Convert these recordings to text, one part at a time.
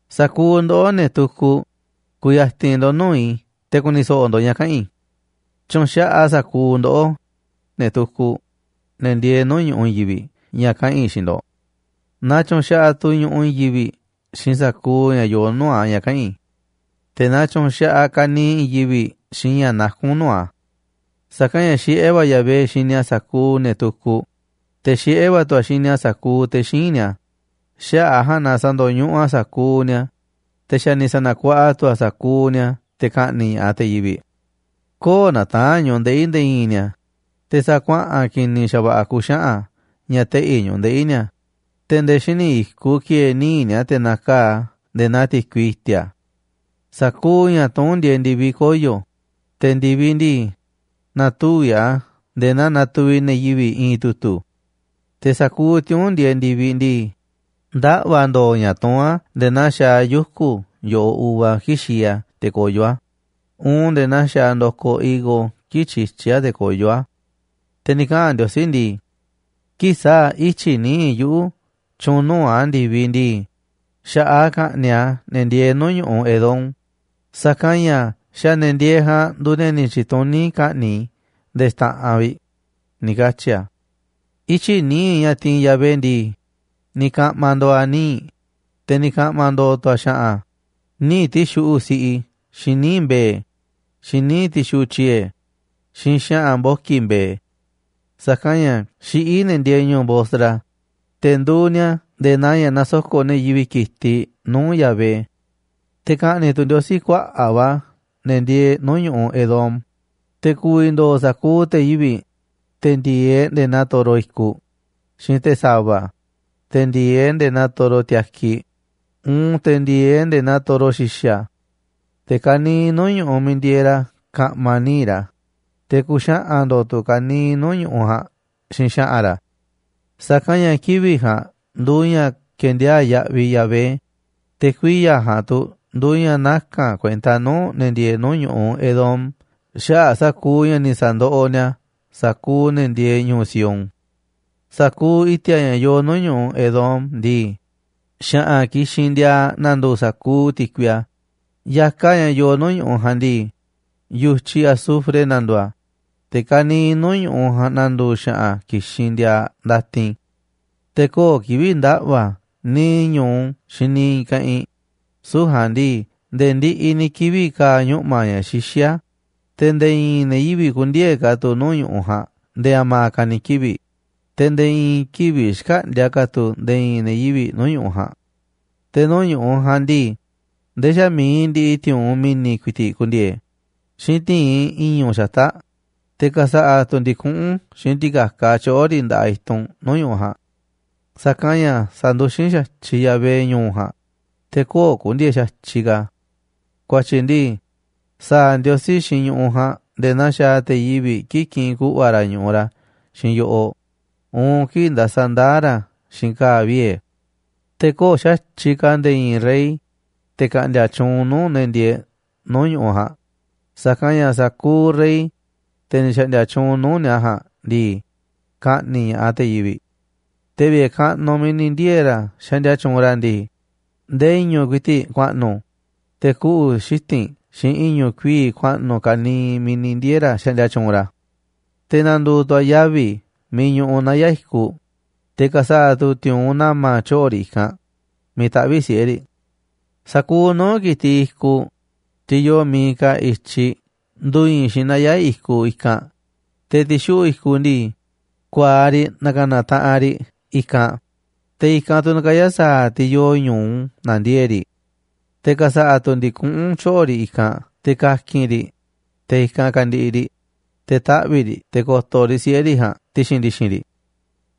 Sa̱kuuꞌ ndoꞌó, ne̱ tukuꞌ, ku̱ya̱ti̱n ndo̱ꞌ nuu̱ꞌ i̱ te̱ ku̱ni̱ so̱ꞌo̱ ndo̱ꞌ ña̱ kaꞌa̱n i̱. Tyu̱u̱n xaꞌaꞌ sa̱kuuꞌ ndoꞌó, ne̱ tukuꞌ, ne̱ ndieeꞌ nuu̱ꞌ ñu̱ꞌuꞌ i̱i̱n yivi̱ꞌ ña̱ kaꞌa̱n i̱ xiinꞌ ndo̱ꞌ. Na tyu̱u̱n xaꞌaꞌ tu̱ ñu̱ꞌuꞌ i̱i̱n yivi̱ꞌ xiinꞌ sa̱kuuꞌ ña̱ yoo nuu̱ꞌ a̱ ña̱ kaꞌa̱n i̱. Te̱ na tyu̱u̱n xaꞌaꞌ ka̱niiꞌ i̱i̱n yivi̱ꞌ xiinꞌ ña̱ nakún nuu̱ꞌ a̱. Sa̱kanꞌ ña̱ xiꞌé va̱ Yahvé xini a̱ sa̱kuuꞌ ne̱ tukuꞌ, te̱ xiꞌé va̱ tu̱ a̱ xini a̱ sa̱kuuꞌ te̱ xíinꞌ ni̱a̱. Xaꞌa̱ꞌ a̱ ja̱a̱nꞌ na sa̱ndo̱ñuꞌuꞌ a̱ sa̱kuuꞌ ni̱a̱, te̱ xa̱ ni̱ sa̱na̱kuaꞌa tu̱ a̱ sa̱kuuꞌ ni̱a̱ te̱ ka̱ꞌni̱ꞌ ña̱ꞌaꞌ te̱ yivi̱ꞌ. Köo̱ꞌ nataa̱nꞌ ñu̱ꞌuꞌ ndeꞌi̱ nde̱e̱ i̱i̱n ni̱a̱, te̱ sa̱a̱ kuaꞌa̱n ki̱ni̱ xa̱va̱ꞌa̱ ku̱xaꞌa̱n ña̱ teꞌi̱ ñu̱ꞌuꞌ ndeꞌi̱ ni̱a̱, te̱ nde̱e̱ xíniꞌ i̱kuꞌ ki̱e̱e̱ níiꞌ ni̱a̱, te̱ na̱kaa̱ꞌ a̱ nde̱e̱ naa ti̱kui i̱ti̱a̱. Sa̱kuuꞌ ña̱ tuún ndieeꞌ ndi̱viꞌ koyo̱, te̱ ndi̱viꞌ ndii, na̱tuvi̱ꞌ a̱ nde̱e̱ naa natuviꞌ ne̱ yivi̱ꞌ i̱i̱n tu̱tu̱. Te̱ sa̱kuuꞌ tiuu̱nꞌ ndieeꞌ ndi̱viꞌ ndii, ndaꞌva̱ ndo̱o̱ ña̱ tuún a̱ nde̱e̱ naa xaaꞌ yuku̱ yo̱ꞌoꞌ uva kii̱ꞌ xii a̱ te̱ koyó a̱ uun nde̱e̱ naa xaaꞌ ndo̱koꞌ higo kii̱ꞌ tyityí a̱ te̱ koyó a̱. Te̱ ni̱ kaꞌa̱n Ndiosí ndi̱i̱: “Kii̱ꞌ sa̱a̱ ityi̱ nii̱ꞌ yuꞌu̱ tyu̱u̱n nuu̱ꞌ a̱ ndi̱viꞌ ndii, xa̱ꞌaꞌ a̱ ka̱ꞌni̱ꞌ a̱ ne̱ ndieeꞌ nuu̱ꞌ ñu̱ꞌuꞌ Edom, sa̱kanꞌ ña̱ xa̱ ne̱ ndieeꞌ ja̱a̱nꞌ nduuꞌ ne̱ ni̱ tyi̱tuní i̱ ka̱ꞌni̱ꞌ i̱ nde̱e̱ xta̱ꞌanꞌ vi̱ꞌ”, ni̱ katyi̱ a̱. Ityi̱ nii̱ꞌ ña̱ tiinꞌ Yahvé ndii, ni̱ ka̱ꞌma̱ ndo̱o̱ a̱ níiꞌ, te̱ ni̱ ka̱ꞌma̱ ndo̱o̱ tu̱ a̱ xa̱ꞌa̱n, níiꞌ ti̱xuꞌu̱ꞌ siꞌi xiinꞌ níiꞌ mbe̱e̱, xiinꞌ níiꞌ ti̱xuꞌu̱ꞌ tyiee̱, xiinꞌ xa̱ꞌa̱n mboki̱ mbe̱e̱. Sa̱kanꞌ ña̱ xiꞌí ne̱ ndieeꞌ ñu̱u̱ Bosra, te̱ nduuꞌ ni̱a̱ nde̱e̱ naa ña̱ nasoko̱ꞌ ne̱ yivi̱ꞌ ki̱tiꞌ nuu̱ꞌ Yahvé, te̱ ka̱ꞌni̱ꞌ tu̱ Ndiosí kuaꞌa̱ꞌ va̱ ne̱ ndieeꞌ nuu̱ꞌ ñu̱ꞌuꞌ Edom. Te̱ ku̱vi̱ ndo̱o̱ sa̱kuuꞌ te̱ yivi̱ꞌ, te̱ ndi̱e̱eꞌ nde̱e̱ naa toro i̱kuꞌ, xiinꞌ te̱ sa̱va̱, te̱ ndi̱e̱eꞌ nde̱e̱ naa toro tiakiꞌ, uun te̱ ndi̱e̱eꞌ nde̱e̱ naa toro xi̱xa̱. Te̱ ka̱niiꞌ nuu̱ꞌ ñu̱ꞌuꞌ miiꞌ ndieeꞌ ra̱ ka̱ꞌma̱ níiꞌ ra̱, te̱ ku̱xaꞌa̱n ndo̱o̱ tu̱ ka̱niiꞌ nuu̱ꞌ ñu̱ꞌuꞌ ja̱a̱nꞌ xiinꞌ xa̱ꞌa̱n ra̱. Sa̱kanꞌ ña̱ kivi̱ꞌ ja̱a̱nꞌ nduuꞌ ña̱ ke̱ndiaa̱ꞌ yaꞌviꞌ Yahvé, te̱ kuiya̱ ja̱a̱nꞌ tu̱ nduuꞌ ña̱ naka̱n a̱ kuenta nuu̱ꞌ ne̱ ndieeꞌ nuu̱ꞌ ñu̱ꞌuꞌ Edom xaꞌa̱ꞌ sa̱kuuꞌ ña̱ ni̱ sa̱ndoꞌoꞌ ni̱a̱ sa̱kuuꞌ ne̱ ndieeꞌ ñu̱u̱ Sión. Sa̱kuuꞌ i̱ti̱a̱ ña̱ yoo nuu̱ꞌ ñu̱ꞌuꞌ Edom ndii, xa̱ꞌa̱n kixinꞌ ndiaaꞌ na̱ndu̱u̱ sa̱kuuꞌ ti̱kui a̱ ya̱kaꞌ ña̱ yoo nuu̱ꞌ ñu̱ꞌuꞌ ja̱a̱nꞌ ndii, yu̱tyiꞌ azufre na̱ndu̱u̱ a̱, te̱ ka̱niiꞌ nuu̱ꞌ ñu̱ꞌuꞌ ja̱a̱nꞌ na̱ndu̱u̱ xa̱ꞌa̱n kixinꞌ ndiaaꞌ ndatin. Te̱ köo̱ꞌ kivi̱ꞌ ndaꞌva̱ a̱ niiꞌ ñu̱u xiinꞌ niiꞌ i̱i̱n keꞌinꞌ, süu̱ꞌ ja̱a̱nꞌ ndii nde̱e̱ ndiꞌiꞌ ni̱ kivi̱ꞌ kaaꞌ ñuꞌma̱ ña̱ xixí a̱, te̱ nde̱e̱ i̱i̱n ne̱ yivi̱ꞌ kü̱ndi̱e̱e̱ ka̱ tu̱ nuu̱ꞌ ñu̱ꞌuꞌ ja̱a̱nꞌ nde̱e̱ a̱ma̱a̱ ka̱ ni̱ kivi̱ꞌ, te̱ nde̱e̱ i̱i̱n kivi̱ꞌ xkäꞌndi̱a̱ ka̱ tu̱ nde̱e̱ i̱i̱n ne̱ yivi̱ꞌ nuu̱ꞌ ñu̱ꞌuꞌ ja̱a̱nꞌ. Te̱ nuu̱ꞌ ñu̱ꞌuꞌ ja̱a̱nꞌ ndii, ndee xa̱ mi̱iꞌ ndiꞌiꞌ ti̱u̱unꞌ mi̱ni̱ ku̱i̱ti̱ꞌ ku̱ndi̱e̱e̱ xiinꞌ ti̱inꞌ i̱ñu̱ꞌ xata̱ꞌ, te̱ ka̱sa̱ꞌa̱ tu̱ ndi̱kuꞌún xiinꞌ ti̱ka̱kaꞌ tyoꞌo̱ riꞌ nda̱ꞌaꞌ i̱tunꞌ nuu̱ꞌ ñu̱ꞌuꞌ ja̱a̱nꞌ. Sa̱kanꞌ ña̱ sa̱nduxín xa̱tyiꞌ Yahvé ñu̱u̱ ja̱a̱nꞌ, te̱ köo̱ꞌ ku̱ndi̱e̱e̱ xa̱tyiꞌ ka̱. Ku̱a̱tyi̱ ndii, sa̱a̱ Ndiosí xiinꞌ ñu̱ꞌuꞌ ja̱a̱nꞌ nde̱e̱ naa xaaꞌ te̱ yivi̱ꞌ kii̱ꞌ kiꞌinꞌ ku̱ꞌva̱ ra̱ ñu̱ꞌuꞌ ra̱ xiinꞌ yo̱ꞌoꞌ uun kii̱ꞌ ndasaꞌ ndaa̱ ra̱ xiinꞌ ka̱a̱ viee̱. Te̱ köo̱ꞌ xa̱tyiꞌ ka̱ nde̱e̱ i̱i̱n rey, te̱ ka̱ꞌndi̱a̱ tyuunꞌ nuu̱ꞌ ne̱ ndieeꞌ nuu̱ꞌ ñu̱ꞌuꞌ ja̱a̱nꞌ, sa̱kanꞌ ña̱ sa̱kuuꞌ rey, te̱ ni̱ xa̱ꞌndi̱a̱ tyuunꞌ nuu̱ꞌ ni̱a̱ ja̱a̱nꞌ ndii, ka̱ꞌni̱ꞌ ña̱ꞌaꞌ te̱ yivi̱ꞌ. Te̱ vi̱ꞌe̱ kaꞌnuꞌ miiꞌ ni̱ ndiee̱ ra̱ xaꞌndia tyuunꞌ ra̱ ndii, ndee i̱ñu̱ꞌ ku̱i̱ti̱ꞌ ku̱a̱ꞌnu̱, te̱ kuꞌu̱ xiti̱nꞌ xiinꞌ i̱ñu̱ꞌ kuii̱ꞌ ku̱a̱ꞌnu̱ ka̱niiꞌ miiꞌ ni̱ ndiee̱ ra̱ xaꞌndia tyuunꞌ ra̱. Te̱ na̱ndu̱u̱ tu̱ a̱ yavi̱ miiꞌ ñuꞌuꞌ naya̱ꞌ i̱kuꞌ, te̱ ka̱sa̱ꞌa̱ tu̱ ti̱u̱unꞌ na̱ma̱ tyoꞌo̱ riꞌ i̱kanꞌ miiꞌ taꞌvi̱ꞌ siꞌe̱ riꞌ. Sa̱kuuꞌ nuu̱ꞌ ki̱tiꞌ i̱kuꞌ, tiꞌ yoo miiꞌ kaaꞌ i̱tyi, ndu̱i̱i̱n xiinꞌ naya̱ꞌ i̱kuꞌ i̱kanꞌ. Te̱ ti̱xuꞌu̱ꞌ i̱kuꞌ ndii, ku̱a̱aꞌ riꞌ na̱ka̱na̱ taꞌanꞌ riꞌ i̱kanꞌ, te̱ i̱kanꞌ tu̱ na̱kaya̱ sa̱a̱ tiꞌ yoo ñu̱u na̱ndiee̱ꞌ riꞌ. Te̱ ka̱sa̱ꞌa̱ tu̱ ndi̱kuꞌún tyoꞌo̱ riꞌ i̱kanꞌ te̱ ka̱ki̱n riꞌ, te̱ i̱kanꞌ ka̱ndi̱ꞌi̱ riꞌ, te̱ taꞌvi̱ꞌ riꞌ te̱ ko̱to̱ riꞌ siꞌe̱ riꞌ ja̱a̱nꞌ ti̱xi̱n ndi̱xi̱n riꞌ.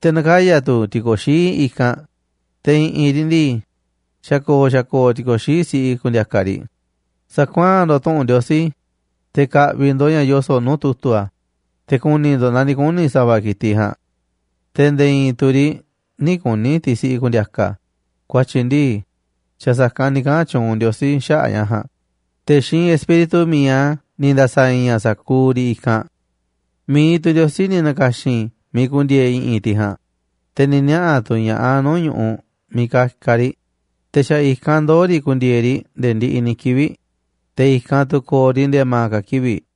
Te̱ na̱kaya̱ tu̱ ti̱ko̱xií i̱kanꞌ, te̱ i̱ꞌi̱n riꞌ ndii, xa̱ ko̱o̱ xa̱ ko̱o̱ ti̱ko̱xií siꞌi ku̱ndi̱a̱ka̱ riꞌ. Sa̱kuaa̱n ndo̱ꞌ tu̱ꞌu̱n Ndiosí, te̱ ka̱ꞌvi̱ ndo̱ꞌ ña̱ yoso̱ꞌ nuu̱ꞌ tu̱tu̱ a̱, te̱ ku̱ni̱ ndo̱ꞌ naaꞌ ni̱ kuni̱ sa̱va̱ ki̱tiꞌ ja̱a̱nꞌ. Te̱ nde̱e̱ i̱i̱n tu̱ riꞌ nï̱ kuni̱ tiꞌ siꞌi ku̱ndi̱a̱ka̱. Ku̱a̱tyi̱ ndii, xa̱ sa̱kanꞌ ni̱ kaꞌa̱n tyuunꞌ Ndiosí xaꞌa̱ꞌ ña̱ ja̱a̱nꞌ, te̱ xiinꞌ Espíritu mi̱iꞌ a̱ ni̱ nda̱sa̱ i̱i̱n a̱ sa̱kuuꞌ riꞌ i̱kanꞌ. Mi̱iꞌ tu̱ Ndiosí ni̱ na̱ka̱xi̱n miiꞌ ku̱ndi̱e̱e̱ i̱ꞌi̱n tiꞌ ja̱a̱nꞌ, te̱ ni̱ niaꞌa̱ tu̱ ña̱ꞌaꞌ a̱ nuu̱ꞌ ñu̱ꞌuꞌ miiꞌ ka̱ka̱ riꞌ, te̱ xa̱ i̱kanꞌ ndoo̱ riꞌ ku̱ndi̱e̱e̱ riꞌ nde̱e̱ ndiꞌiꞌ ni̱ kivi̱ꞌ, te̱ i̱kanꞌ tu̱ ko̱o̱ riꞌ nde̱e̱ a̱ma̱a̱ ka̱ kivi̱ꞌ.